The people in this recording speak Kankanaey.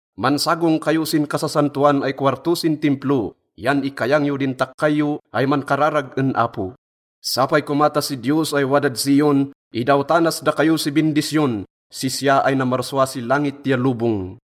Mansagong kayo sin Kasasantoan ay Kowarto sin Timplo, yan ikayang yo din takkay yo ay mankararag en Apo. Sapay koma ta si Diyos ay wadad Zion, idawtanas dakayo si bindisyon, sisya ay namarsua si langit ya lobong.